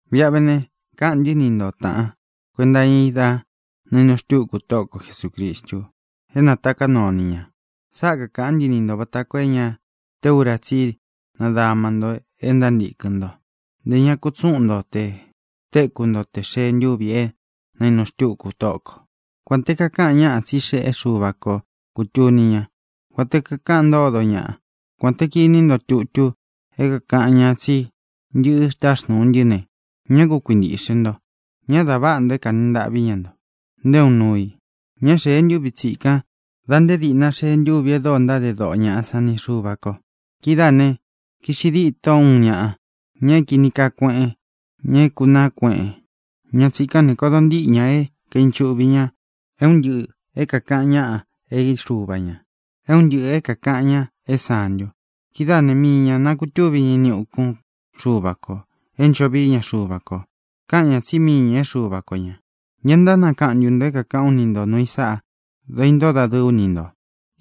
Viꞌa ve ne, káꞌān ntɨ́ ni nto, tāꞌan, kuenta iña i dá naīnu xtúku Tóꞌo ko Jesūcristu é nātaká nuu o ni ñā. Sáꞌa kākaꞌán ntɨ ni ntō vata koo é ña te ura tsí i nadama nto e ntántīkɨn ntó, ntē ña kutsúꞌun nto tē téku nto tē xee ntúvi é nainu xtúku Tóꞌo kō. Kuān te kakáꞌan ñáꞌa tsí xeꞌé Xuva ko kūtuni ñá, kuān te kákaꞌan ntódo ñaꞌa, kuān te kiní nto tutu é kākaꞌan ñáꞌa tsí ntɨꞌɨ táxnūu ntɨ́ ne, ñá ku kuintīꞌxe nto. Ñá dā váꞌa nto é kanī ntaꞌví ñaꞌa nto nté uun nuu i. Ñá xēe ntúvi tsikan da nté dīꞌna xee ntúvi e dóo ntáde doꞌo ñaꞌa san ni Xuva kō. Kidáā ne, kiꞌxi dîtó uun ñaꞌa, ña é kīni kaa kueꞌen, ña é kūnaá kueꞌen. Ña tsīkán ne, kodo ntíꞌi ña é kīnchuꞌvi ña é un ntɨꞌɨ̄ é kākaꞌan ñáꞌa é xuva ñā, é un ntɨꞌɨ̄ é kākaꞌan ñáꞌa é santu. Kidáā né, mii ña nākutúvi ña ini ukún Xuva kō é ncho vií ña Xuva kō. Káꞌan ñā tsí mii ñā é Xuva ko ñā. ¿Ña ntánakaꞌan ntū nto é kākaꞌán u ni nto nūu i sáꞌa dá īntóo dadɨɨ ú ni ntō?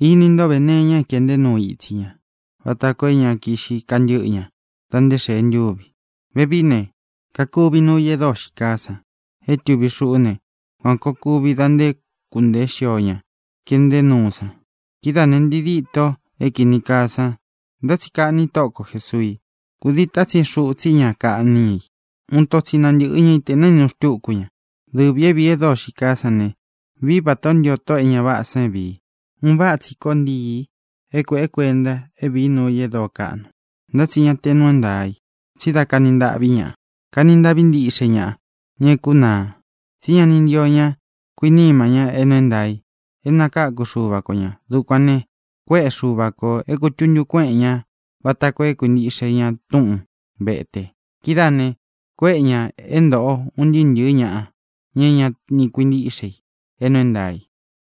Ini ntó ve nee iña é kēꞌnté nuu itsí ña vata koo é ña kiꞌxi kantɨ́ꞌɨ ña dā nté xēe ntúvi i. Vevií ne, kakuvi nuu i e dóo xií kaa san é tuvi xuꞌú ne, kuān koo kuvi da nté kūntee xío ña keꞌnté nuu san. Kidáā ne, ntii dîto é kīni kaa san, ntá tsi kaꞌni Tóꞌo ko Jēsuu i. Kūdii tátsin xuꞌu tsi ña kaꞌní ña i. Uun ito tsi nantɨꞌɨ ña i tē naínu xtúku ña. Dɨvī é vīí e dóo xií kaa san ne, vií vatā ó ntio tóꞌō é ña váꞌā san é vīi. Un váꞌa tsi koo ntii é kuēꞌé kuenta, é vīí nuu i e dóo kaꞌnu. Ntá tsi ña te nuu é ntaā i, tsí da kani ntaꞌví ñaꞌa. Kani ntaꞌví ntiꞌxe ñaꞌa, ña é kunaa, tsí ña ni ntio ña kuiníma ña é nuu é ntaā i é nakākú Xuva ko ñā. Dukuān ne, kuéꞌe Xuva kō é kūtuntu kuéꞌen ña vata koo é kuīntiꞌxe ña túꞌun vetē. Kidáā ne, kuéꞌe ñā é ntōꞌo un ntɨɨ́ ntɨ̄ɨ́ ñaꞌa, ña é ña ni kuintíꞌxe i é nuu é ntaā í,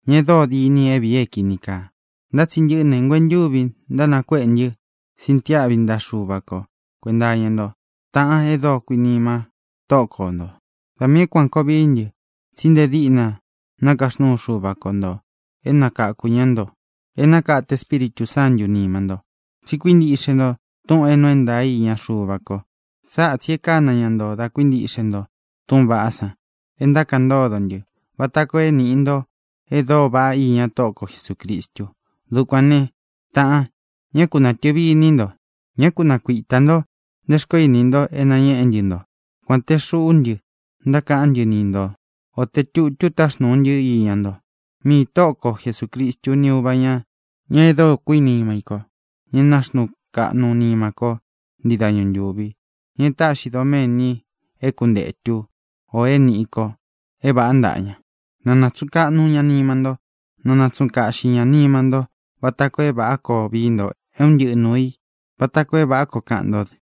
ña e dóo diní i é vīi é kīni kaa. Ntá tsi ntɨꞌɨ́ ne, nguentúvi ntánakuéꞌe ntɨ́ sintiáꞌvi ntaꞌa Xuva ko kuēnta iña nto, taꞌan e dóo kuinima Tóꞌo ko ntō. Da miī é kuān koo vií ntɨ, tsí nte díꞌna nakaxnúu Xuva ko ntō é nakakū ñá nto, é nakate Espíritū Sántū nima ntó, tsi kuíntiꞌxe nto túꞌūn é nuu é ntaā í iña Xuva ko. Sáꞌa tsī e kána ña nto da kuíntiꞌxe nto túꞌūn vaꞌá san é ntákaꞌan ntódo ntɨ́, vata koo é nīꞌi nto e dóo vaꞌá iña Tóꞌo ko Jesūcristu. Dukuān né, taꞌan, ñá ku nātɨvi iní nto; ñá ku nakuitā ntó nte xkoó ini nto é nañéꞌe ntɨ́ nto, kuān te xuꞌú ntɨ ntákaꞌán ntɨ ni nto, o te tūtú taxnūu ntɨ́ iña nto. Miī Tóꞌo ko Jesūcristu ni Úva ñā, ña e dóo kuinima í kō, ña é nāxnuu kaꞌnu nima kó ntii dañu ntūvi, ña e táꞌxi doméni é kuntetu ō é nīꞌi ko é vāꞌá ntaꞌa ña, na nātsuꞌun kaꞌnu ña nima nto. Na nātsuꞌun kaꞌxi ña nima ntó vata koo é vāꞌá koo vií nto é un ntɨꞌɨ nuū i, vata koo é vāꞌá koo kaꞌan ntó dɨ.